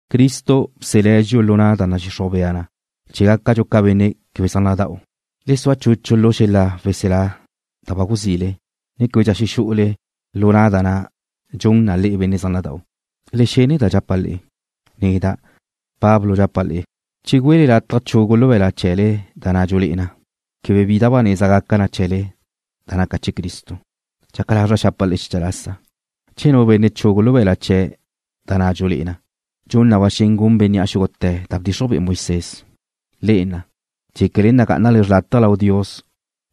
Cristo bselé̱' dxi'u lu na' da nadxixruj bea na chee̱ gácadxu ca benne' quebe zaj nada'u. Le sua chuchu lu xel-la weselá da ba guzile, ne québedxa xexú'ule lu na' da na' dxun na le'e benne' zaj nada'u. Le xene da dxapa' le'e. Neda', Pablo, dxapa' le'e, che güele lataj chugu lu be̱la' chee̱le da na' dxulé'e na, quebe bi da ba neza gaca chee̱le da naca chee̱ Cristo. Dxaca lazra' xapa' le'e xecha lasa, che nu benne' chugu lu be̱la' chee̱' da na' dxulé'e na, dxun na ba xen gun bénnea' xúgute̱ da bdxixruj be'e Moisés. Le'e na' dxéquele nagá'anale xrlátaje lau Dios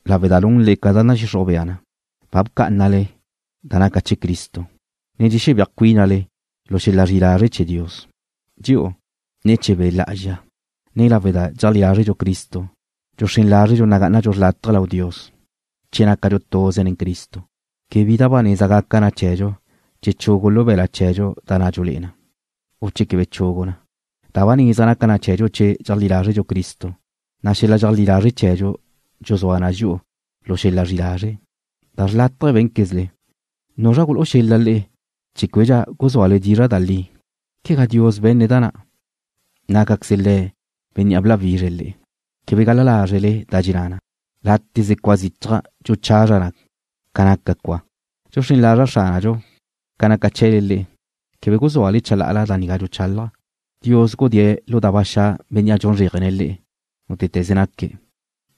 lawe' da nunle ca nadxixruj bea na, ba bcá'anale da naca chee̱ Cristo, ne dxexebéaj cuínale lu xel-la zri'i lazre' chee̱ Dios. Dxi'u, ne̱ chee̱ Be' Lá'azxa, ne lawe' da dxeajlí lázredxu Cristo, dxuxrén lázredxu nagá'anadxu xrlátaje lau Dios. Che nácadxu tuze nen Cristo, quebe bi da ba neza gaca na chee̱dxu che chugu lu be̱la' chee̱dxu da na' dxulé'e na, u che quebe chugu na. Da ba neza naca na chee̱dxu che dxeajlí lázredxu Cristo, na' xel-la dxeajlí lazre' chee̱dxu dxuzúa na dxi'u lu xel-la zri'i lazre'. Da xrlátaje bé̱nquezle. ¿Nuzra gulú'u xel-la le'e chee̱ québedxa guzúale dizra' da li? Quegá Dios be̱ne̱' da na'. Nácaqueze Le̱' Bénnea' bláwizre̱' le'e. Quebe gal-la lázrele da dxenná na: Láteze cua zichaj dxuchazra na ca naca cua. Dxuxrén lazra' Xránadxu ca naca chee̱le le'e, quebe guzúale chalá'ala da nigá dxuchálaja'. Dios gudée̱' lu da ba xa' bénnea' dxun zréajene̱' le'e, nútete̱ze naque̱'.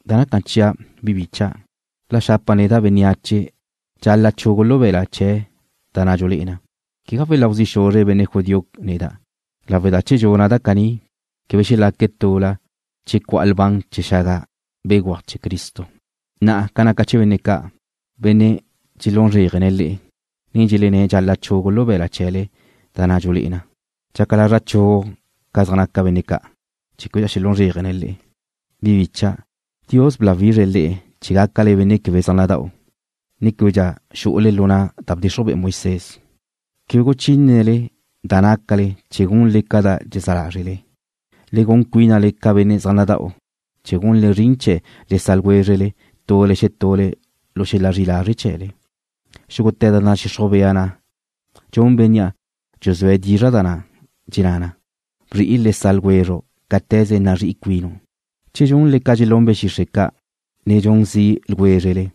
Da naca chia', bi bicha', la xapa' neda' bénneache dxal-la' chugu lu be̱la' chee̱' da na' dxulé'e na, quegá weláu zi' xuzre benne' judío neda' lawe' da che dxuna' da caní quebe xelaque̱' tula che cu'a lban chee̱ xaga béguaj chee̱ Cristo. Na'a ca naca chee̱ benne' ca', benne' dxelún zréajene̱' le'e, ne dxelenné̱' dxal-la' chugu lu be̱la' chee̱le da na' dxulé'e na, dxaca lazra' chugu ca da zaj naca benne' ca' chee̱ québedxa xelún zréajene̱' le'e. Bi bícha'dau', Dios bláwizre̱' le'e chee̱ gácale benne' quebe zaj nada'u, ne québedxa xu'ule lu na' da bdxixruj be'e Moisés. Quebe guchínele da nácale chee̱ gunle ca da dxezá lázrele. Le gun cuínale ca benne' zaj nada'u, chee̱ gunle zrin chee̱ le sa' ljwézrele tule xetule lu xel-la zri'i lazre' chee̱le. Xúgute̱ da nadxixruj bea na dxun bénnea' dxuzúe̱' dizra' da na' dxenná na: Bzri'i le sa' ljwezru' cáte̱ze nazrí'i cuinu'. Che dxunle ca dxelún be̱ xixre' ca', ne dxun zi' ljwézrele,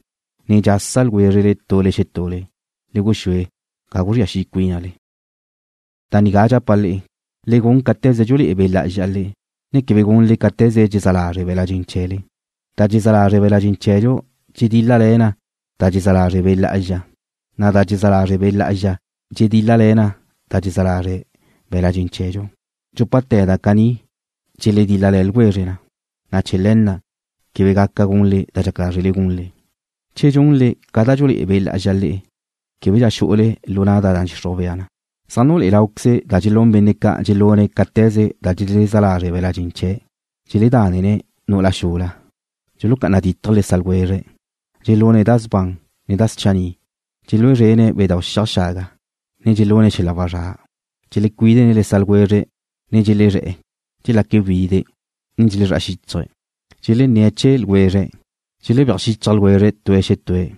ne dxasa ljwézrele tule xetule, le guxúe ga guzría xi' cuínale. Da nigá dxapa' le'e: Le gun cáte̱ze dxulé'e Be' Lá'azxa le'e, na' quebe gunle cáte̱ze dxezá lazre' be̱la' dxen chee̱le. Da dxezá lazre' be̱la' dxen chee̱dxu dxedíl-lale̱ na da dxezá lazre' Be' Lá'azxa, na' da dxezá lazre' Be' Lá'azxa dxedíl-lale̱ na da dxezá lazre' be̱la' dxen chee̱dxu. Dxúpate̱ da caní dxeledíl-lale̱ ljwezre na, na' chee̱ le̱ na' quebe gaca gunle da dxaca lázrele gunle. Che dxunle ca da dxulé'e Be' Lá'azxa le'e, québedxa xu'ule lu na' da nadxixruj bea na. Zaj nulé'e láuqueze da dxelún benne' ca' dxelune̱' cáte̱ze da dxezá lazre' be̱la' dxen chee̱': Deledále̱ne̱' nu'ula xula. Dulucá'ana dítaje̱' le sa' ljwezre̱' Dxelune̱' da sban, ne da schanni'. Dxelúe szrene̱' bedau' xiaj xaga, ne dxelune̱' xel-la wazrá'. Dxelecuídene̱' le sa' ljwezre̱', ne dxelezré̱'e̱. Dxelaque̱' wide', ne dxelezrá'a xíchaje̱'. Dxelenné̱' chee̱ ljwezre̱'. Dxelebéaj xichaj ljwezre̱' tue̱' xetue̱',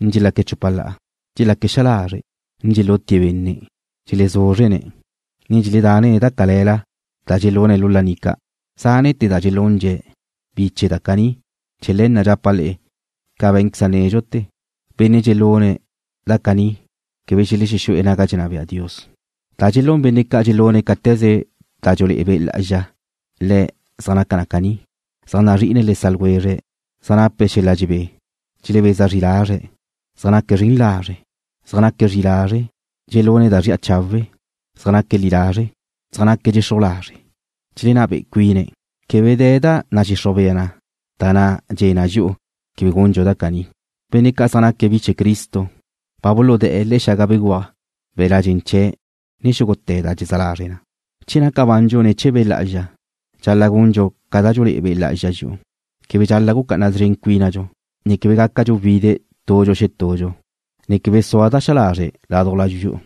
ne dxelaque̱' chupa la'a. Dxelaque̱' xa lazre', ne dxelutie̱' benne'. Dxelezúzrene̱', ne dxeledanne̱' da cale̱la da dxelune̱' lu laní ca'. Zánete̱ da dxelundxe̱' bi chee̱ da caní. Che le̱ na' dxapa' le'e ca bé̱nqueza' nédxute̱, benne' dxelune̱' da caní quebe xelexú'e̱ naga dxenná bea Dios. Da dxelún benne' ca' dxelune̱' cáte̱ze da dxulé'e Be' Lá'azxa le̱' zaj naca na caní: Zaj nazri'ine̱' le sa' ljwezre̱', ne zaj nape̱' xel-la dxebé. Dxelebeza zri lazre̱', ne zaj naque̱' zren lazre'. Zaj naque̱' zri'i lazre', ne dxelune̱' da zri'a chawe'. Zaj naque̱' li lazre'. Zaj naque̱' dxexruj lazre', ne dxelenná be'e cuine̱'. Quebe de̱ da nadxixruj bea na da dxe̱ na dxi'u quebe gundxu da caní. Benne' ca' zaj naque̱' bi chee̱ Cristo ba buludé̱'e̱ le̱'e̱ xaga béguaj be̱la' dxen chee̱' nen xúgute̱ da dxezá lazre na. Che naca bandxu ne̱ chee̱ Be' Lá'azxa, dxal-la' gundxu ca da dxulé'e Be' Lá'azxa dxi'u. Quebe dxal-la' gucá'ana szren cuínadxu, ne quebe gácadxu wide' tudxu xetudxu, ne quebe sua da xa lazre' ládujla dxi'u.